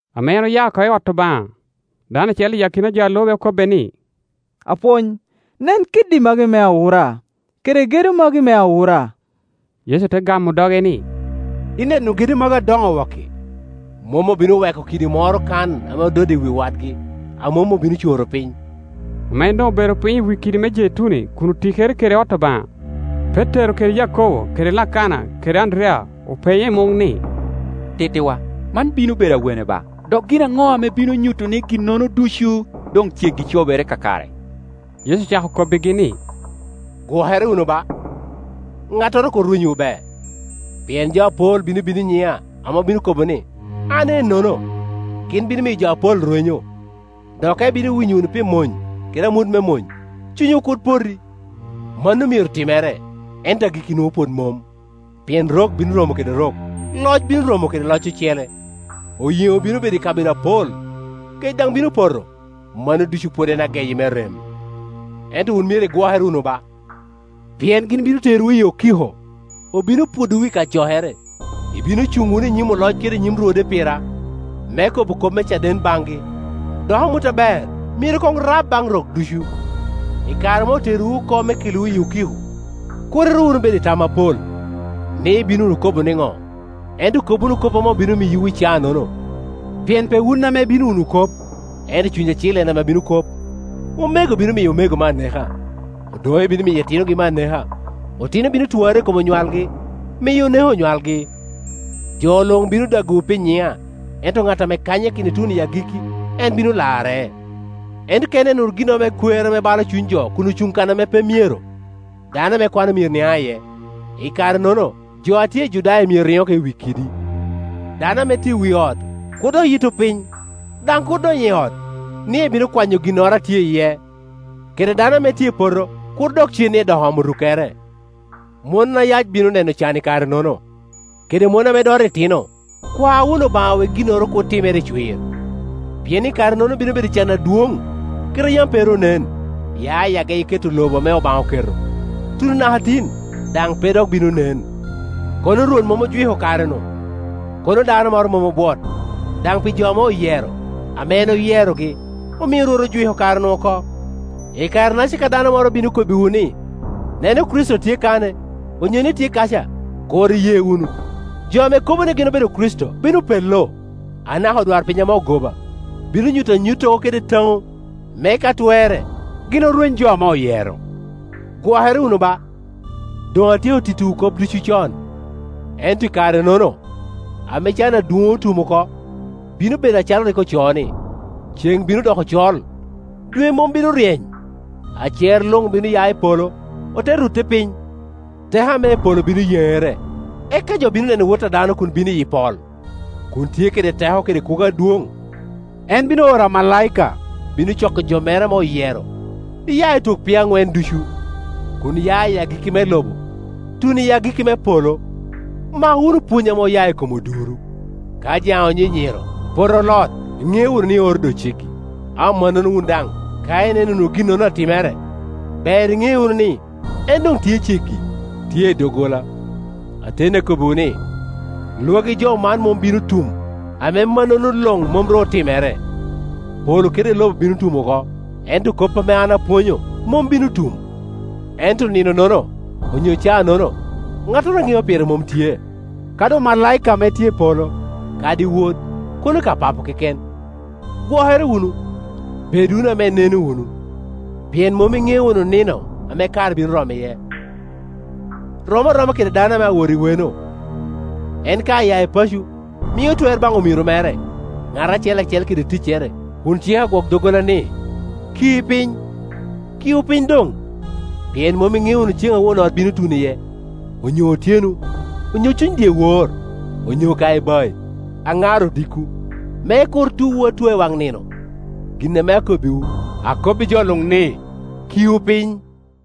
Ame en aya oko i ot Obaŋa, dano acel i akina jo a lube okobbe ni, “Apwony, nen kiddi magi me awura, kede gedo magi me awura!” Yecu te gamo doge ni, “Ineno gedo magi adoŋo wok-ki? Mom obino weko kidi moro kan ame ododde i wi wadgi, a mom obino coro piny.” Ame en doŋ obedo piny i wi kidi me Jeituni kun otikere kede ot Obaŋa, Petero kede Yakobo kede Lakana kede Anderiya openye i muŋ ni, “Tittiwa, man bino bedo awene ba? Dok gin aŋo ame bino nyuto ni ginnono ducu doŋ ceggi cobere kakare?” Yecu ocako kobbigi ni, “Gwokere wunu ba, ŋattoro kur rwenywu be. Pien jo apol bino bino i nyiŋa, ame obino kobo ni, ‘An ennono’; gin bino miyo jo apol rwenyo. Dok ka ibino winyo wunu pi mony, kede amut me mony, cunywu kur poti; mano myero timere, ento agikki nwoŋo pwod mom. Pien rok bino romo kede rok, loc bino romo kede loc ocele, oyeŋo bino bedo i kabedo apol, kec daŋ bino poto; mano ducu pwod en ageyi me rem. “Ento wun myero igwokere wunu ba; pien gin bino terowu i okiko, obino pwodowu i kacokere; ibino cuŋ wunu i nyim oloc kede i nyim rwode pira, me kobo kop me caden baŋgi. Dok amut aber myero koŋ rab baŋ rok ducu. Ikare ame oterowu oko me kelowu i okiko, kur iru wunu bedo i tam apol, ni, ibino wunu kobo niŋo? Ento kob wunu kop ame obino miyowu i caanono; pien pe wun ame ibino wunu kop, ento Cuny Acil en a bino kop. Omego bino miyo omegogi me aneka, odoŋe bino miyo itinogi me aneka, otino bino twarre i kom onywalgi, miyo oneko onywalgi. Jo luŋ bino dagowu pi nyiŋa: ento ŋat ame kanyakino ituno i agikki, en bino larre. “Ento ka ineno wunu ginnoro me kwer ame balo cuny jo kun ocuŋ kan ame pe myero (dano ame kwano myero niaŋ iye), i kare-nono jo a tye i Judaya myero riŋ oko i wi kidi, dano ame tye i wi ot kur dok yitto piny, daŋ kur dony i ot, ni ebino kwanyo ginnoro a tye iye; kede dano ame tye i poto kur dok cen ni edok omo rukkere. Mon ayac bino neno can i kare-nono, kede mon ame doto itino! Kwa wunu Obaŋa wek ginnono kur timere i cwir. Pien i kare-nono bino bedo can adwoŋ, kit a yam pe ru onen, ya i ageyi keto lobo ame Obaŋa oketo, tuno naka tin, daŋ pe dok bino nen. Kono Rwot mom ojwiko kare-nu, kono dano moro mom obwot; daŋ pi jo ame oyero, ame en oyerogi, omio Rwot ojwiko kare-nu oko. “I kare-naca ka dano moro bino kobbiwu ni, ‘Neno, Kricito tye kan-e, onyo ni, tye kaca’, kur iye wunu. Jo ame kobo ni gin obedo Kricito bino pello, anaka odwarpiny ame ogoba, bino nyuto anyuttogo kede taŋo, me ka twerre gin orweny jo ame oyero. Gwokere wunu ba; doŋ atyeko tittiwu kop ducu con. “Ento i kare-nono, ame can adwoŋ otum oko, bino bedo acalo rik ocoo ni, ‘Ceŋ bino doko col, dwe mom bino ryeny, acer luŋ bino ya i polo, ote rutte piny, teko ame i polo bino yeŋere’; eka jo bino neno Wot a dano kun bino iyi pol, kun tye kede teko kede kwogo adwoŋ. En bino oro amalaika, bino coko jo mere ame oyero, iya i twok piny aŋwen ducu, kun ya i agikki me lobo, tuno i agikki me polo. “Mak wunu pwony ame oya i kom oduro: ka jaŋe onyinyiro, pote olot, iŋeo wunu ni oro doŋ ceggi. Ammannono wun daŋ, ka ineno wunu ginnono atimere, ber iŋe wunu ni, en doŋ tye ceggi, tye i doggola. Ateni akobbiwu ni, lwagi jo man mom bino tum, ame mannono luŋ mom ru otimere. Polo kede lobo bino tum oko, ento kop ame an apwonyo mom bino tum. “Ento nino-nono, onyo caa-nono, ŋattoro a ŋeo pire mom tye, kadi omalaika ame tye i polo, kadi Wod, kono ka Papo keken. Gwokere wunu, bed wunu ame ineno wunu, pien mom iŋeo wunu nino ame kare bino romo iye. Rom aroma kede dano ame awot i weno; en ka aya i paco, mio twer baŋ omiro mere, ŋat acel acel kede ticcere, kun ciko agwok doggola ni, ki piny. Kiu piny doŋ, pien mom iŋeo wunu ceŋ a won ot bino tuno iye, onyo otyeno, onyo cuny dyewor, onyo ka ibai, aŋar odiko; me kur tuwu atua i waŋ nino. Gin ame akobbiwu, akobbi jo luŋ ni, Kiu piny.”